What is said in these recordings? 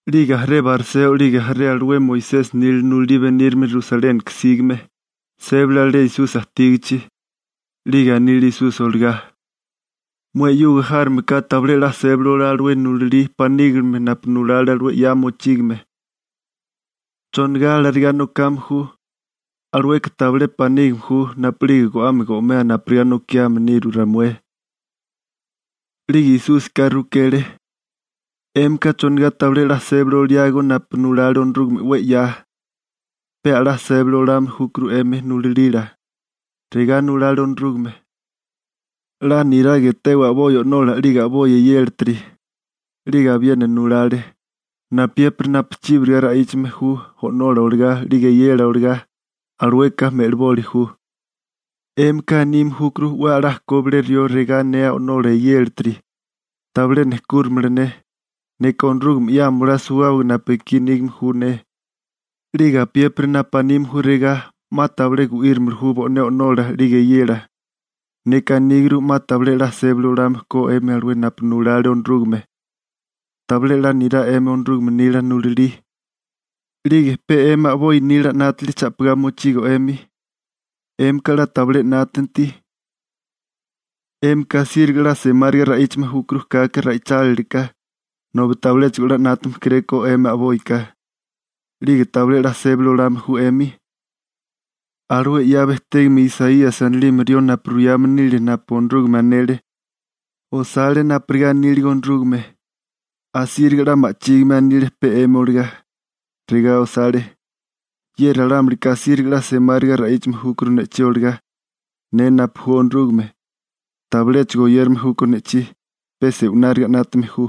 'Lige jaré bariseo 'lige jaré alué Moisesi nila nulalí benírame Rusalénika sígame, sébale alé Esusi ajtígichi. 'Lige anile Esusi olagá: ―Mué 'yuga járome ka tabilé 'la sébali olá alué nulalí panígilime napu nulale alué 'ya mochígame. ¿Chonigá alarigá nokame ju? Alueka tabilé panígime ju napu'lige go'ame go'mea napurigá nokiame niru ramué. 'Lige Esúsika rukele: ―'Émika ¿chonigá tabilé 'la sébali oliágó napu nulale Onorúgame 'we 'ya? Pe a'lá sébali olame júkuru 'emi nulalila. Regá nulale Onorúgame: «'La niraga etewa a'boi o'nola 'lige a'boi eyélatiri.» 'Lige abiena nulale: «Napuyépiri napu chíbiriga ra'íchame ju o'nola olagá 'lige eyela olagá, alueka me'liboli ju.» 'Émika anime júkuru 'we a'lá ko bilé rió regá anea o'nola eyélatiri: «Tabilé nejkúrimala ne, neka Onorúgame 'yámolá suwábaga napu ekí nígame ju ne», 'lige apiépiri napu anime ju regá, 'ma tabilé gu'írimili ju bo'né o'nola 'lige eyela. Neka aníguru 'ma tabilé 'la sébali olame ko 'emi alué napu nulale Onorúgame, tabilé 'la nirá 'emi Onorúgame nila nulalí, 'lige pe 'emi a'boi nila 'nátili cha'pigá mochigo 'emi. ¡'Émika 'la tabilé 'nátanti! 'Émika asíriga 'la semáriga ra'íchame júkuru kaka ra'ichálilaká, nobi tabiléchigo 'la 'nátame kéréko 'emi a'boika, 'lige tabilé 'la sébali olame ju 'emi. Alué 'ya bejtégame Isaíasi anilime rió napu ruyame nile napu Onorúgame anele, osale napurigá anílige Onorúgame. Asíriga 'la ma'chígime anile pe 'emi olagá. Regá osale: Ye ralámulika asíriga 'la semáriga ra'íchame júkuru ne'chí olagá, ne napu ju Onorúgame, tabiléchigo oyérame júkó ne'chí. Pe se'wináriga 'nátame ju.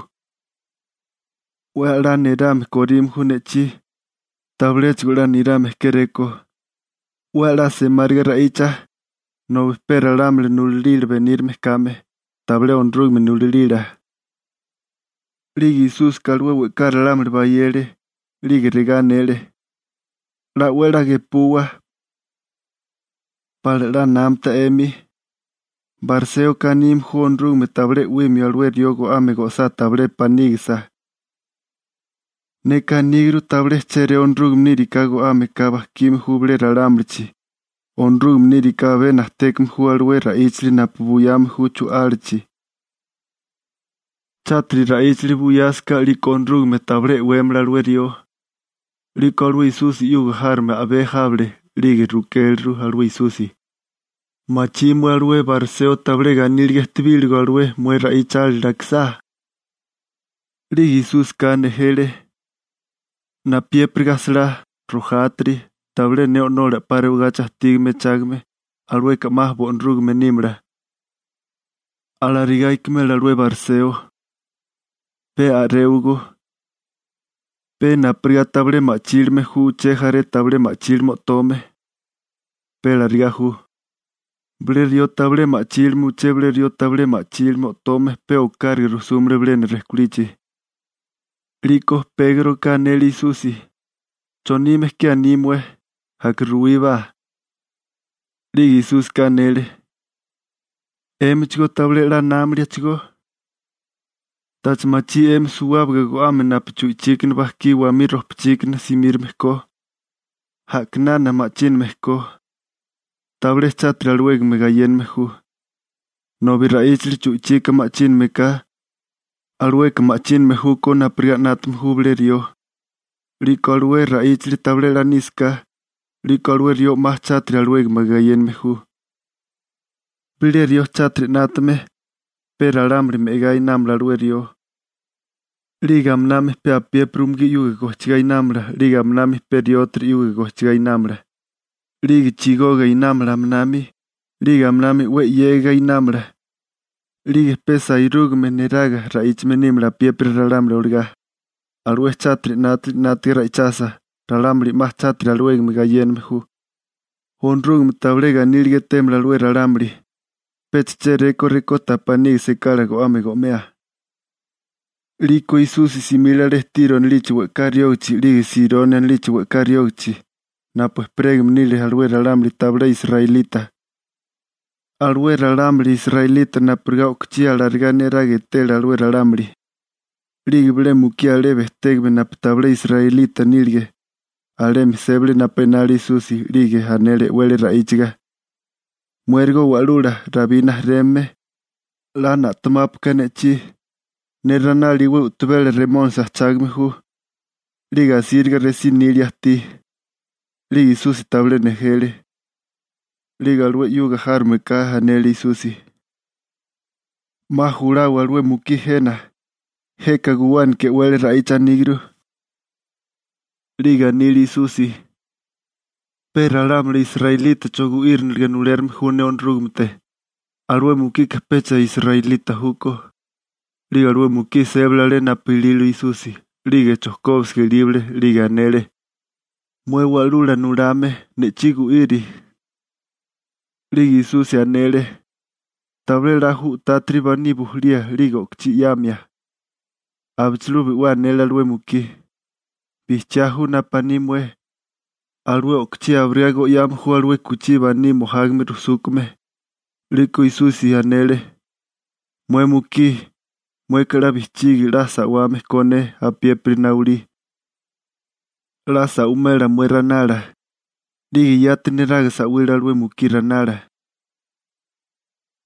'We a'lá nerame korime ju ne'chí, tabiléchigo 'la nirame kéréko, 'we a'lá semáriga ra'icha nobi pe ralámuli nulalila benírame kame, tabilé Onorúgame nulalila. 'Lige Esúsika alué we'ká ralámuli bayele, 'lige regá anele: ―'La 'we a'lá gepuwa. ¿Pala 'la námata 'emi? Bariséoka anime ju Onorúgame tabilé 'wimio alué rió go'ame go'sá tabilé panígisa. Neka aníguru tabilé chéré Onorúgame níriká go'ame ka bajkime ju bilé ralámulichi. Onorúgame níriká abé najtékame ju alué ra'íchali napu buyame ju chu'álachi. Chátiri ra'íchali buyásaká 'liko Onorúgame tabilé e'wémala alué rió. 'Liko alué Esusi 'yuga járome a'bé jábele, 'lige rukéliru alué Esusi: ―¿Machí mué alué bariseo tabilé ganíliga ejtebíligo alué mué ra'ichálila ajkisá? 'Lige Esúsika nejele: ―Napiépiri gajsalá, rojátiri, tabilé ne O'nola 'pa rewagachi ajtígame echágame, alueka 'ma bo'narúgme nímala. Alarigá ikimela alué bariseo. Pe a'réwagó. Pe napurigá bilé rió tabilé ma'chílime uché jaré tabilé ma'chílime o'tome, pe alarigá ju. Bilé rió tabilé ma'chílime uché bilé rió tabilé ma'chílime o'tome pe okáraga rujsúmala bilena rejkolichi. 'Liko Pégroka anele Esusi: ―¿Chonime ke aní mué? Aka ruwíbá. 'Lige Esúsika anele: ―¿'Émichigó tabilé 'la námaliachigó? ¿Tacha machí 'emi suwábaga go'ame napu chu'ichíkana bajkí wamí rojpachíkana simírame ko, a'kinana ma'chíname ko? Tabilé chátiri alawégame gayéname ju. Nobi ra'íchali chu'ichika ma'chíname ka, alueka ma'chíname júkó napurigá 'nátame ju bilé rió. 'Liko alué ra'íchali tabilé 'la nísaká, 'liko alué rió 'ma chátiri alawégame gayéname ju. Bilé rió chátiri 'nátame, pe ralámuli me'gá einámala alué rió, 'lige aminami pe apiépiri umugí 'yuga gojchigá einámala 'lige aminami pe riótiri 'yuga gojchigá einámala, 'lige chigoga einámala aminami, 'lige aminami 'we 'yégiga einámala, 'lige pe sairúgame neraga ra'íchame nímala apiépiri ralámuli olagá. Alué chátiri 'nátili 'nátaga ra'íchasa, ralámuli 'ma chátiri alawégame gayéname ju, Onorúgame tabilé ganíliga etémala alué ralámuli, pecha chéréko rekó ta panige sekala go'ame go'mea. 'Liko Esusi simile alé Tiro anilichi we'ká riógichi 'lige Sironi anilichi we'ká riógichi, napu ejperégame nile alué ralámuli tabilé israelita. (Alué ralámuli israelita napurigá o'kochí alarigá neraga etele alué ralámuli.) 'Lige bilé mukí alé bejtégame napu tabilé israelita nílige, alemi sébale napu enale Esusi 'lige anile e'wele ra'íchaga: ―¡Muérigo Wa'lula, Rabí rijimala, 'la na'temápuaká ne'chí! Ne ranala iwé bilé u'tabela remónisi ajchágame ju, 'lige asíriga resí nilia ajtí. 'Lige Esusi tabilé nejele. 'Lige alué 'yuga járomeka anele Esusi: ―'Ma julawa alué mukí jena, jeka guwánaka e'wele ra'icha aníguru. 'Lige anile Esusi: ―Pe ralámuli israelítacho gu'íriniliga nulérigime ju ne Onorúgamete. Alué mukika pecha israelita júkó. 'Lige alué mukí sébale alé napu ilile Esusi, 'lige chojkóbisiga ilíbale, 'lige anele: ―¡Mué Wa'lula nulame, ne'chí gu'iri! 'Lige Esusi anele: ―Tabilé 'la ju u'tátiri baní bujilía 'lige o'kochí 'yamia. Abichilubi 'we anele alué mukí: ―Bijchiá ju napu aní mué, alué o'kochí abirigá go'yame ju alué kuchí baní mojágame rujsúkame. 'Liko Esusi anele: ―¡Mué mukí, mueka 'la bijchigi 'la sa'wame ko ne apiépiri nawilí! 'La sa'wimela mué ranala. 'Lige yati neraga sa'wile alué mukí ranala.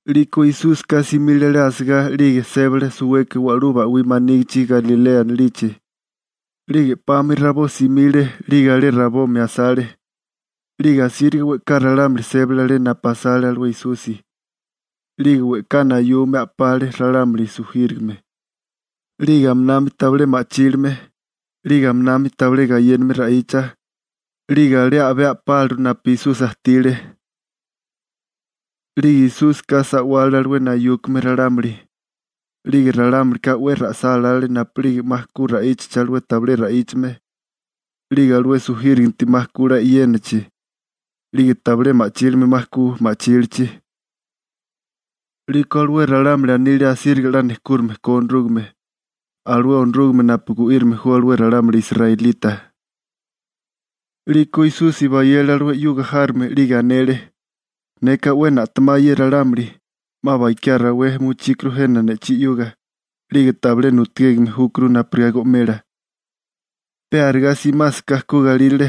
'Liko Esúsika simile alé asigá 'lige sébale suweke wa'lú ba'wí manígichi Galilea anilichi, 'lige 'pami rabó simile 'lige alé rabomi asale. 'Lige asíriga we'ká ralámuli sébale alé napu asale alué Esusi, 'lige we'ká nayume a'pale ralámuli sujírigame, 'lige aminami tabilé ma'chílime, 'lige aminami tabilé gayéname ra'icha, 'lige alé a'bé a'páliru napu Esusi ajtile. 'Lige Esúsika sa'wale alué nayúkame ralámuli. 'Lige ralámulika 'we ra'sálále napu'lige 'ma ku ra'íchachi alué tabilé ra'íchame, 'lige alué sujíriginti 'ma ku 'la e'yénachi, 'lige tabilé ma'chílime 'ma ku ma'chílichi. 'Liko alué ralámuli anile asíriga 'la nejkúrame ko Onorúgame, alué Onorúgame napu gu'írime ju alué ralámuli israelita. 'Liko Esusi bayele alué 'yuga járome 'lige anele: ―Neka 'we na'temá ye ralámuli. 'Ma bakiá rawé mochíkuru jena ne'chí 'yuga, 'lige tabilé nutugégeme júkuru napurigá go'mela. Pe arigá simásaká ku galírale,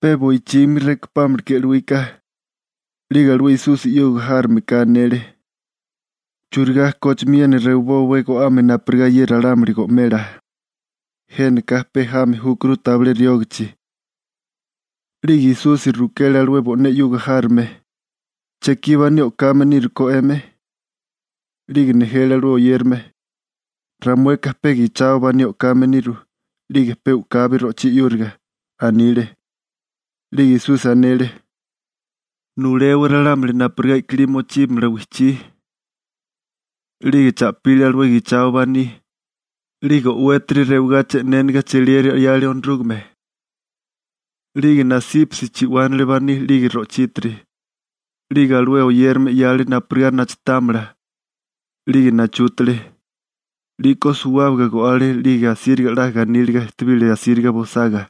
pe boichimi rekupámala e'luíka. 'Lige alué Esusi 'yuga járomeka anele: ―¿Churigá kóchimiyéna rewibówé go'ame napurigá ye ralámuli go'mela? Jénaka pe jami júkuru tabilé riógichi. 'Lige Esusi rukele alué bo'né 'yuga járome: ―¿Chekí baní o'kame nírukó 'emi? 'Lige nejele alué oyérame: ―Ramueka pe gichao baní o'kame niru, 'lige pe u'kabi ro'chí 'yúriga ―anile. 'Lige Esusi anele: ―Nulewa ralámuli napurigá i'kilí mochímala wijchí. 'Lige cha'pile alué gichao baní, 'lige o'wétiri rewagachi e'nénaga cheliera 'yale Onorúgame. 'Lige nasípasi chi'wánale baní 'lige ro'chítiri. 'Lige alué oyérame 'yale napurigá nachutámala, 'lige nachútele. 'Liko suwábaga go'ale 'lige asíriga 'la ganíliga ejtebile asíriga bosaga.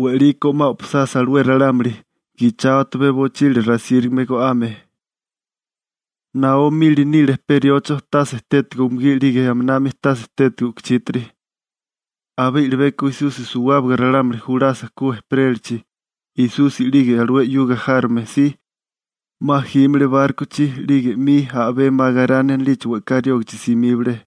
We'liko 'ma o'pasasa alué ralámuli, gichao atabé bochile rasírigame go'ame. Naó mili nile pe riocho tase tétiga umugí 'lige aminami tase tétiga u'kuchítiri. Abé i'libeko Esusi suwábaga ralámuli julasa ku ejperélachi, Esusi 'lige alué 'yuga járome si, 'ma jímale bárkochi 'lige 'mi a'bé Magarani anilichi we'ká riógachi simíbale.